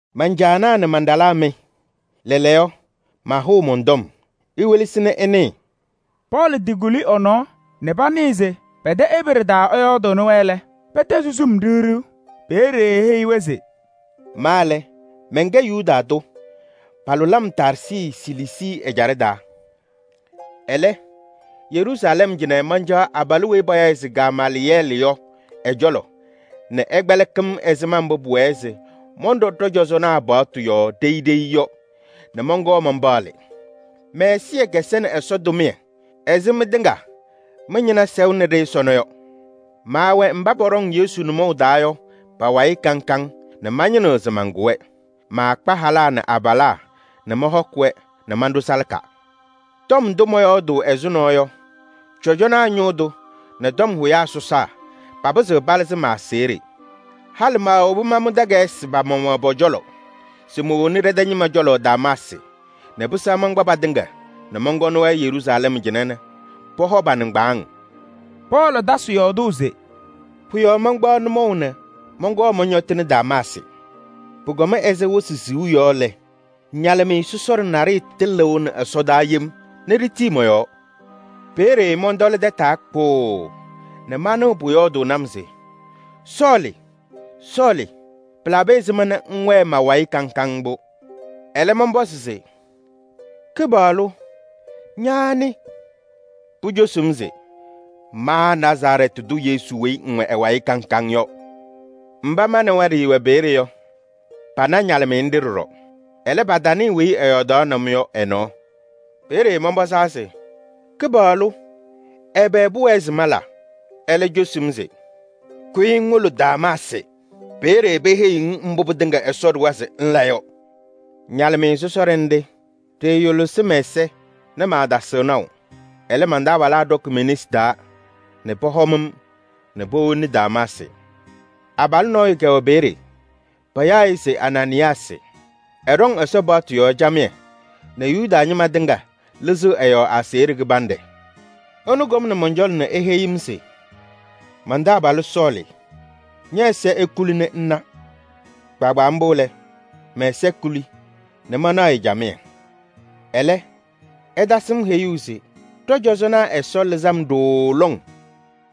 “Man-caanaa nɛ man-ɖalaa mɩ! Lɛɛlɛɛyɔ, mahʋʋ mɔn-tɔm, iwelesi nɛ ɩnɩɩ.” Pɔɔlɩ tɩkuli ɛ-nɔɔ nɛ panɩɩ se pɛ-tɛ Ebree taa ɛyɔɔdɩnɩ-wɛ lɛ, pɛtɛzɩ sum ɖiɣ ɖiɣ. Peeye eheyi-wɛ se: “Ma lɛ, mɛnkɛ Yuda tʋ, palʋlɩ-m Taarsɩ Siliisii ɛjaɖɛ taa. Ɛlɛ, Yeruusalɛm cɩnɛ mancaɣ abalʋ weyi payaɣ se Gamaalɩyɛɛlɩ yɔ ɛ-cɔlɔ nɛ ɛkpɛlɩkɩ-m ɛzɩma mbʋ pʋwɛɛ se mɔnɖɔ ɖɔ-cɔzɔnaa paɣtʋ yɔɔ ɖeyi ɖeyi yɔ nɛ mɔnkɔɔ manpaɣlɩ. Mɛ-ɛzɩyɛ kɛsɛnɩ Ɛsɔ tʋmɩyɛ ɛzɩ mɩtɩŋa mɩ-ñɩna sɛʋnɩ-ɖɩ sɔnɔ yɔ. Maawɛ mba pɔɖɔŋ Yesu nʋmɔʋ taa yɔ pa-wayɩ kaŋ kaŋ nɛ mañɩnɩɣ se mankʋ-wɛ. Maakpa halaa nɛ abalaa nɛ mɔhɔkɩ-wɛ nɛ manɖʋ salaka. Tɔm ndʋ mɔyɔɔdʋʋ ɛzʋnɔ yɔ, cɔjɔnaa ñʋʋ tʋ nɛ tɔm hʋyaa sɔsaa papɩzɩɣ palɩzɩ ma-aseɣɖe. Halɩ maawobi mamʋ takayɩsɩ pa-maɣmaɣ pɔ-cɔlɔ se mowoni ɖɛ-tɛ ñɩma cɔlɔ Damaasɩ nɛ pɩsɛɣ mankpa patɩŋa nɛ mɔnkɔnɩ-wɛ Yeruusalɛm cɩnɛ nɛ pɔhɔ pa-nɩŋgbaaŋ.” Pɔɔlɩ tasɩ yɔɔdʋʋ se: “Pʋ-yɔɔ mankpaɣ nʋmɔʋ nɛ mɔnkɔɔ mɔñɔtɩnɩ Damaasɩ. Pʋkɔm ɛzɩ wɩsɩ siɣu yɔ lɛ, ñalɩmɩyɛ sɔsɔɖɛ naɖɩyɛ tɩlɩʋnɩ ɛsɔdaa yem nɛ ɖitii mɔ-yɔɔ. Peeye mɔntɔlɩ tataa kpʋʋʋ nɛ manɩɣ pʋyɔɔdʋʋnɩ-m se: ‘Sɔɔlɩ! Sɔɔlɩ! Pɩlabɩ ɛzɩma nɛ ŋwɛɛ ma-wayɩ kaŋ kaŋ mbʋ?’ Ɛlɛ mɔnpɔzɩ se: ‘Kɩpaɣlʋ! Ña anɩ?’ Pucosi-m se: ‘Ma Nazarɛɛtɩ tʋ Yesu weyi ŋwɛ ɛ-wayɩ kaŋ kaŋ yɔ.’ Mba ma nɛ wɛ ɖɩɩwɛ peeye yɔ, pana ñalɩmɩyɛ nɖɩ ɖɔɖɔ. Ɛlɛ, patanɩɩ weyi ɛyɔɔdaɣnɩ-m yɔ ɛ-nɔɔ. Peeye mɔnpɔzaa se: ‘Kɩpaɣlʋ! Ɛbɛ pʋwɛɛ se mala?’ Ɛlɛ cosi-m se: ‘Kʋyɩ ŋwolo Damaasɩ, peeye peheyiɣ-ŋ mbʋ pɩtɩŋa Ɛsɔ ɖʋwa se ŋla yɔ.’ Ñalɩmɩyɛ sɔsɔɖɛ nɖɩ, ɖɩɩyʋlɩsɩ mɛ-ɛza nɛ maatasɩɣ naʋ. Ɛlɛ, man-taabalaa ɖɔkɩ me-nesi taa nɛ pɔhɔm-m nɛ powoni Damaasɩ. Abalʋ nɔɔyʋ kɛwɛ peeye, payaɣ-ɩ se Anaanɩyaasɩ. Ɛɖɔŋ Ɛsɔ paɣtʋ yɔɔ camɩyɛ nɛ Yuda ñɩma tɩŋa lɩzɩɣ ɛ-yɔɔ aseɣɖe kɩbanɖɛ. Ɛnʋ kɔmnɩ mɔn-cɔlɔ nɛ eheyi-m se: ‘Man-taabalʋ Sɔɔlɩ! Ñɛ-ɛza ekuli nɛ ŋna!’ Kpaagbaa mbʋ lɛ, mɛ-ɛza tɩkuli nɛ manaɣ-ɩ. Ɛlɛ ɛtasɩ-m heyuu se ɖɔ-cɔzɔnaa Ɛsɔ lɩzɩ-m ɖooo lɔŋ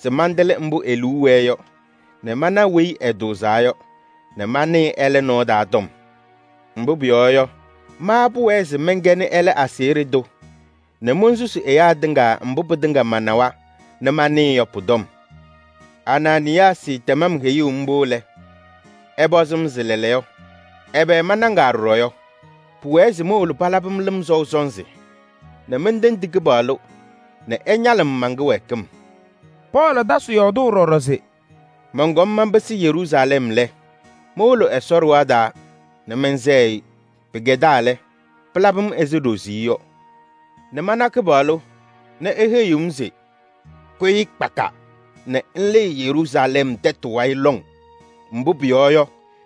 se mantɩlɩ mbʋ e-liu wɛɛ yɔ nɛ mana Weyi Ɛtʋʋzaa yɔ nɛ manɩɩ ɛlɛ nɔɔ taa tɔm. Mbʋ pʋyɔɔ yɔ, ma pʋwɛɛ se mɛnkɛnɩ ɛlɛ aseɣɖe tʋ nɛ monsusi ɛyaa tɩŋa mbʋ pɩtɩŋa manawa nɛ manɩɩ yɔ pʋ-tɔm. Anaanɩyaasɩ tɛm-m heyuu mbʋ lɛ, ɛpɔzɩ-m se lɛɛlɛɛyɔ, ɛbɛ manɖaŋaa ɖɔɖɔ yɔ? Pʋwɛɛ se mowolo palabɩ-m lɩm sɔʋ sɔnzɩ nɛ mentendi Kɩpaɣlʋ nɛ ɛñalɩ-m man-kɩwɛɛkɩm.” Pɔɔlɩ tasɩ yɔɔdʋʋ ɖɔɖɔ se: “Mɔnkɔm manpɩsɩ Yeruusalɛm lɛ, mowolo Ɛsɔ ɖɩɣa taa nɛ mɛnsɛɣ-ɩ. Pɩkɛdaa lɛ, pɩlabɩ-m ɛzɩ ɖoziye yɔ nɛ mana Kɩpaɣlʋ nɛ eheyiɣ-m se: ‘Kʋyɩ kpaka nɛ ŋlɩɩ Yeruusalɛm tɛtʋ wayɩ lɔŋ, mbʋ pʋyɔɔ yɔ,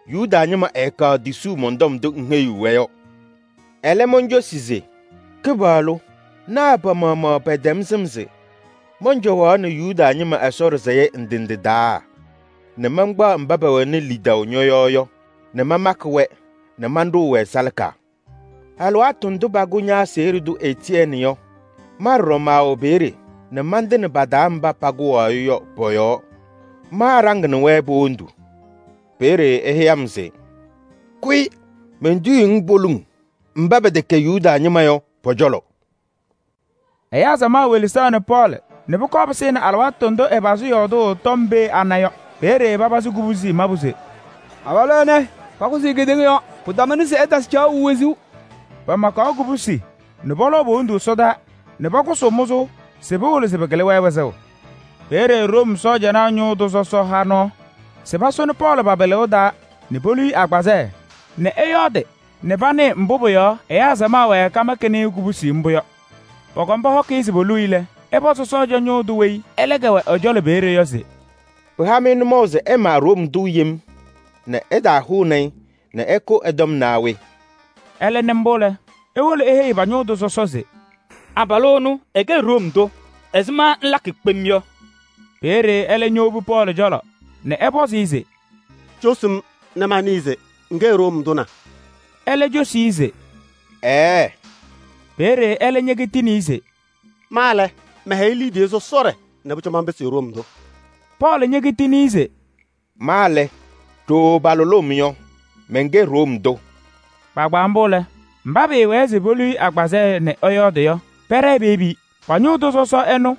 Yuda ñɩma ɛɛkaɣ tisuu mɔn-tɔm ndʋ ŋheyiɣ-wɛ yɔ.’ Ɛlɛ moncosi se: ‘Kɩpaɣlʋ! Naa pa-maɣmaɣ pɛtɛm sɩm se mɔncɔwaɣnɩ Yuda ñɩma Ɛsɔ ɖɩsɛyɛ ndɩ ndɩ taa nɛ mankpaɣ mba pɛwɛnɩ lidaʋ ñɔ-yɔɔ yɔ nɛ mamakɩ-wɛ nɛ maɖʋʋ-wɛ salaka! Alɩwaatʋ ndʋ pakʋ ña-aseɣɖe tʋ Etiyɛɛnɩ yɔ, ma ɖɔɖɔ maawɛ peeye nɛ mantɩnɩ pa-taa mba pakʋwaɣ-ɩ yɔ pɔ-yɔɔ. Maaɖaŋnɩ-wɛ po-wondu.’ Peeye eheyi-m se: ‘Kʋyɩ! Mentiyiɣ-ŋ poliŋ, mba pɛtɛkɛ Yuda ñɩma yɔ pɔ-cɔlɔ.’” Ɛyaa samaɣ welesaɣnɩ Pɔɔlɩ nɛ pʋkɔɔ pɩsɩnɩ alɩwaatʋ ndʋ ɛyɔɔdɩ tɔm pee ana yɔ. Peeye papazɩ kubusi mabʋ se: “Abalʋ ɛnɛ, pakʋsɩ-ɩ kedeŋa yɔɔ! Pɩtamʋnɩ se ɛtasɩ caɣʋ wezuu!” Pamakaɣ kubusi nɛ pɔlɔʋ po-wondu ɛsɔdaa nɛ pakʋsʋʋ mʋzʋʋ se pɩwɩlɩ se pɩkɩlɩ-wɛ wɩzʋʋ. Peeye Room sɔɔjanaa ñʋʋ tʋ sɔsɔ ha nɔɔ se pasʋnɩ Pɔɔlɩ pa-pɩlɩʋ taa nɛ polu-i agbazɛɛ nɛ ɛyɔɔdɩ nɛ panɩɩ mbʋ pʋ-yɔɔ ɛyaa samaɣ wɛɛ kamakɩnɩ-ɩ kubusi mbʋ yɔ. Pɔkɔm pɔhɔkɩ-ɩ se poluu-i lɛ, ɛpɔzɩ sɔɔjanaa ñʋʋ tʋ weyi ɛlɛ kɛwɛ ɛ-cɔlɔ peeye yɔ se: “Pɩha-mɩ nʋmɔʋ se ɩma Room tʋ yem nɛ ɩtahʋnɩ-ɩ nɛ ɩkʋ ɛ-tɔm naa we?” Ɛlɛ nɩ mbʋ lɛ, ewolo eheyi pa-ñʋʋ tʋ sɔsɔ se: “Abalʋ ɛnʋ ɛkɛ Room tʋ! Ɛzɩma ŋlakɩ kpem yɔ?” Peeye ɛlɛ ñowobi Pɔɔlɩ cɔlɔ nɛ ɛpɔzɩ-ɩ se: “Cosi-m nɛ manɩɩ se ŋkɛ Room tʋ na?” Ɛlɛ cosi-i se: “Ɛɛɛ!” Peeye ɛlɛ ñekitini-i se: “Ma lɛ, mɛhɛyɩ liidiye sɔsɔɖɛ nɛ pʋcɔ manpɩsɩ Room tʋ.” Pɔɔlɩ ñekitini-i se: “Ma lɛ, ɖooo palʋlʋʋ-m yɔ, mɛnkɛ Room tʋ.” Kpaagbaa mbʋ lɛ, mba pɩɩwɛɛ se polu-i agbazɛɛ nɛ ɛyɔɔdɩ yɔ, pɛɖɛɛ peyebi-i. Pa-ñʋʋ tʋ sɔsɔ ɛnʋ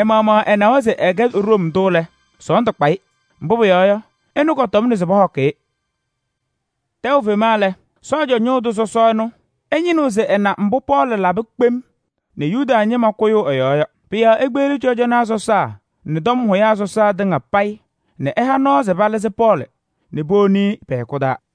ɛ-maɣmaɣ ɛnawa se ɛkɛ Room tʋ lɛ, sɔɔndʋ kpa-ɩ, mbʋ pʋyɔɔ yɔ, ɛnʋ kɔtɔmnɩ se pɔhɔkɩ-ɩ. Tɛʋ fema lɛ, sɔɔjanaa ñʋʋ tʋ sɔsɔ ɛnʋ ɛñɩnɩɣ se ɛna mbʋ Pɔɔlɩ labɩ kpem nɛ yuda ñɩma kʋyʋʋ ɛ-yɔɔ yɔ. Pʋ-yɔɔ ekpeɣli cɔjɔnaa sɔsaa nɛ tɔm hʋyaa sɔsaa tɩŋa payɩ nɛ ɛha nɔɔ nɛ palɩzɩ Pɔɔlɩ nɛ powoni-i pɛ-hɛkʋ taa.